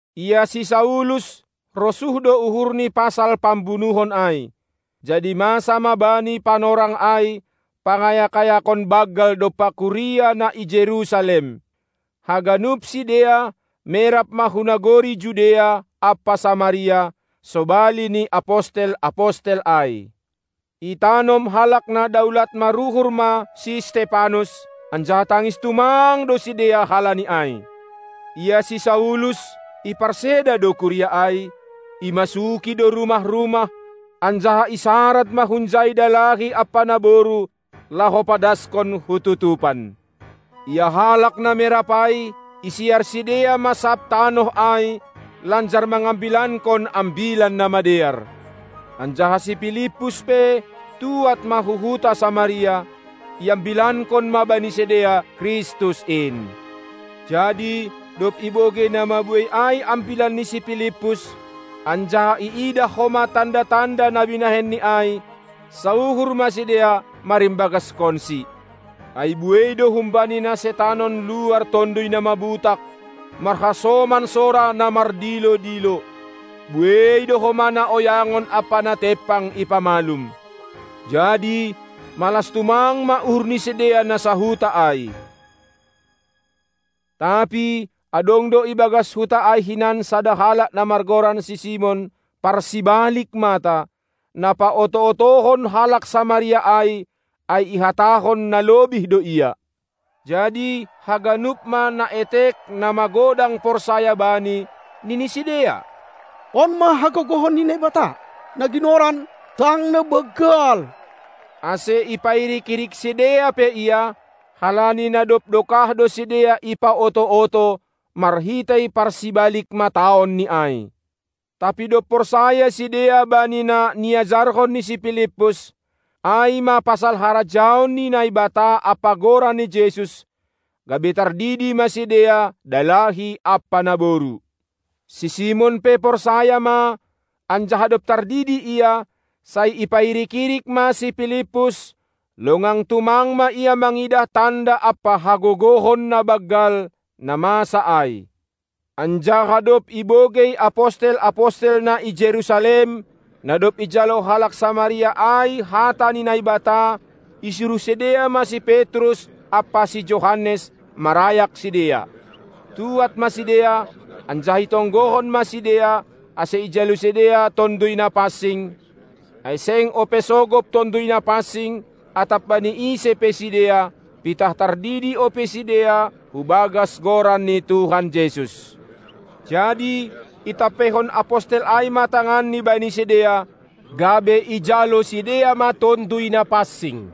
Ia si Saulus rosuh do uhurni pasal pambunuhon ai. Jadi masa ma bani panorang ai pangayak-ayakon banggal dompak kuria na i Jerusalem. Haganup sidea, merap ma hu nagori Judea ampa Samaria, sobali ni apostel-apostel ai. Itanom halak na daulat maruhur ma si Stepanus, anjaha tangis tumang do sidea halani ai. Ia si Saulus, iparseda do kuria ai; imasuki do rumah-rumah, anjaha isarad ma hunjai dalahi ampa naboru laho padaskon hu tutupan. Ia halak na merap ai, isiar sidea ma sab tanoh ai lanjar mangambilankon Ambilan Namadear. Anjaha si Pilippus pe tuad ma hu huta Samaria, iambilankon ma bani sidea Kristus in. Jadi dob ibogei na mabuei ai ambilan ni si Pilippus, anjaha iidah homa tanda-tanda na binahenni ai, sauhur ma sidea marimbagaskonsi. Ai buei do humbani na setanon luar tonduy na mabutak marhasoman sora na mardilo-dilo. Buei do homa na oyangon ampa na tempang ipamalum. Jadi malas tumang ma uhur ni sidea na sahuta ai. Tapi adong do i bagas huta ai hinan sada halak na margoran si Simon, parsibalik mata, na paoto-otohon halak Samaria ai, ai ihatahon na lobih do ia. Jadi haganup ma naetek na magodang porsaya bani, nini sidea: On ma hagogohon ni Naibata, na ginoran: Tang na-Banggal! Ase ipairik-irik sidea pe ia, halani na dob dokah do sidea ipaoto-oto marhitei parsibalik-mataonni ai. Tapi dob porsaya sidea bani na niajarhon ni si Pilippus, ai ma pasal harajaon ni Naibata ampa Goran ni Jesus, gabe tardidi ma sidea dalahi ampa naboru. Si Simon pe porsaya ma, anjaha dob tardidi ia, sai ipairik-irik ma si Pilippus, longang tumang ia mangindah tanda ampa hagogohon na banggal, na masa ai. Anjaha dob ibogei apostel-apostel na i Jerusalem, na dob ijalo halak Samaria ai hata ni Naibata, isuruh sidea ma si Petrus ampa si Johannes marayak sidea. Tuad ma sidea anjaha itonggohon ma sidea ase ijalo sidea Tonduy Napansing, ai seng ope sogop Tonduy Napansing atap bani ise pe sidea, pitah tardidi ope sidea hu bagas Goran ni Tuhan Jesus. Jadi itampeihon apostel ai ma tanganni bani sidea, gabe ijalo sidea ma Tonduy Napansing.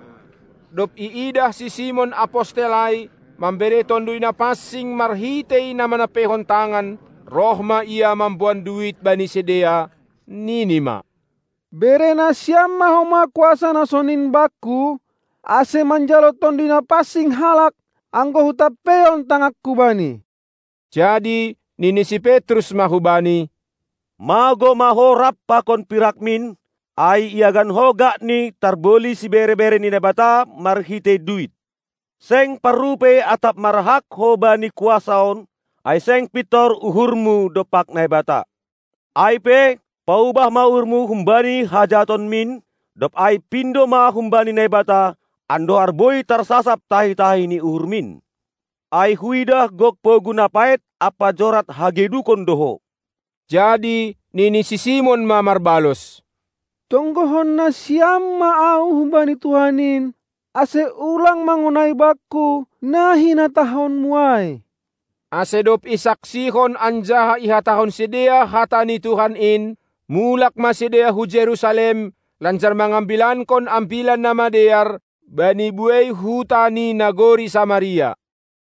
Dob iidah si Simon apostel ai mambere Tonduy Napansing marhitei na manampeihon tangan, roh ma ia mamboan duit bani sidea, nini ma: Bere nasiam ma homa kuasa na sonin bakku, ase manjalo Tonduy Napansing halak, anggo hutampeihon tanganku bani. Jadi nini si Petrus ma hubani: Magou ma ho rap pakon pirakmin, ai iagan ho gakni tarboli sibere-bere ni Naibata marhitei duit! Seng parrupei atap marhak ho bani kuasa on, ai seng pintor uhurmu dompak Naibata. Ai pe, paubah ma uhurmu humbani hajahatonmin, dob ai pindo ma humbani Naibata, andohar boi tarsasap tahi-tahi ni uhurmin. Ai huidah gok pogu na paet ampa jorat hagedukon do ho. Jadi nini si Simon ma marbalos: Tonggohon nasiam ma ahu hubani Tuhan in, ase ulang mangonai bakku na hinatahonmu ai. Ase dob isaksihon anjaha ihatahon sidea hata ni Tuhan in, mulak ma sidea hu Jerusalem, lanjar mangambilankon Ambilan Namadear bani buei huta ni nagori Samaria.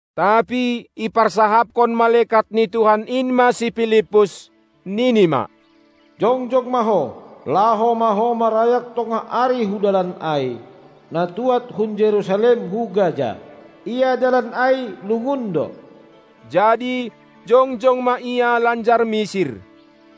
Tapi iparsahapkon malekat ni Tuhan in ma si Pilippus, nini ma: Jongjong ma ho, laho ma ho marayak tongah ari hu dalan ai, na tuad hun Jerusalem hu Gaza. Ia dalan ai lungun do. Jadi jongjong ma ia lanjar misir.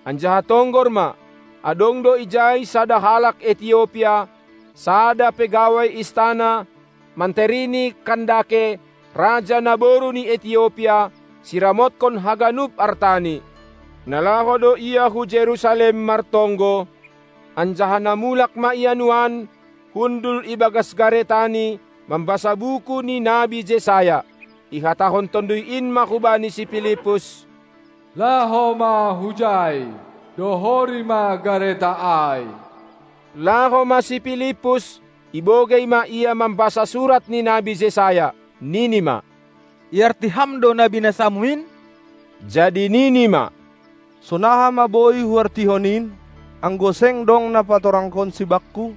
Anjaha tonggor ma, adong do ijai sada halak Etiopia, sada pegawai istana, manteri ni Kandake, Raja naboru ni Etiopia, siramotkon haganup artani. Na laho do ia hu Jerusalem martonggo, anjaha na mulak ma ia nuan, hundul i bagas garetani mambasa buku ni nabi Jesayas. Ihatahon Tonduy in ma hubani si Pilippus: Laho ma hujai, dohori ma gareta ai! Laho ma si Pilippus, ibogei ma ia mambasa surat ni nabi Jesayas. Nini ma: Iarti ham do na binasamu in? Jadi nini ma: Sonaha ma boi huartihon in, anggo seng dong na patorangkonsi bakku.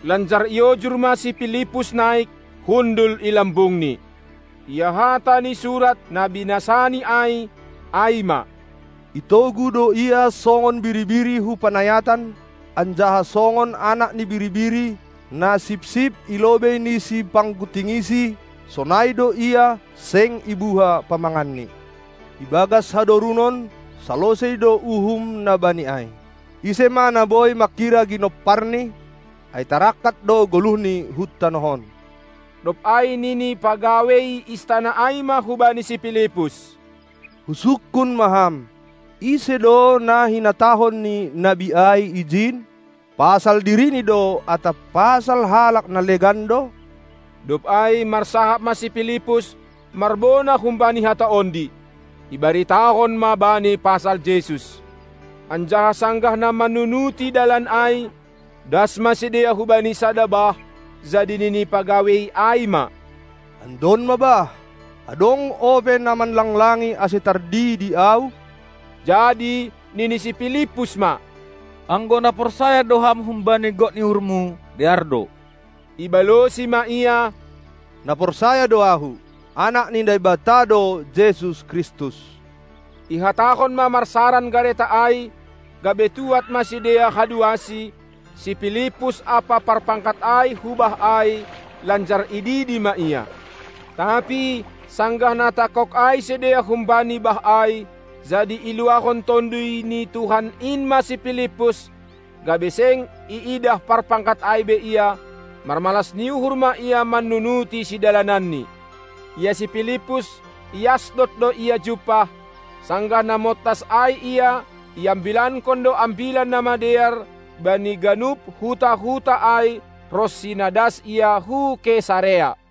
Lanjar iojur ma si Pilippus naik, hundul i lambungni. Ia hata ni surat, na binasani ai, ai ma: Itogu do Ia songon biri-biri hu panayatan anjaha songon anak ni biri-biri, na sipsip i lobei ni sipangguntingisi, sonai do Ia seng ibuha pamanganni. Ibagas hadorunon salosei do uhum na bani ai. Ise ma na boi manghira ginomparni? Ai tarangkat do goluhni hun tanoh on. Dob ai nini pagawei istana ai ma hubani si Pilippus: Husungkun ma ham, ise do na hinatahon ni nabi ai ijin? Pasal dirini do atap pasal halak na legan do? Dob ai marsahap ma si Pilippus marbona humbani hata ondi, ibaritahon ma bani pasal Jesus. Anjaha sanggah na mannunuti dalan ai, das ma sidea hubani sada bah; jadi nini pagawei ai ma: Andon ma bah! Adong ope na manlanglangi ase tardidi ahu? Jadi nini si Pilippus ma: Anggo na porsaya do ham humbani gok ni uhurmu, dear do! Ibalosi ma ia: Na porsaya do ahu, Anak ni Naibata do Jesus Kristus! Ihatahon ma marsaran gareta ai, gabe tuad ma sidea haduasi, si Pilippus ampa parpangkat ai hu bah ai, lanjar ididi ma ia. Tapi sanggah na tangkog ai sidea humbani bah ai, jadi iluahon Tonduy ni Tuhan in ma si Pilippus, gabe seng iidah parpangkat ai be ia; marmalas ni uhur ma ia mannunuti sidalanni. Ia si Pilippus, i Asdod do ia jumpah; sanggah na montas ai ia, iambilankon do Ambilan Namadear bani ganup huta-huta ai ronsi na das ia hu Kesarea.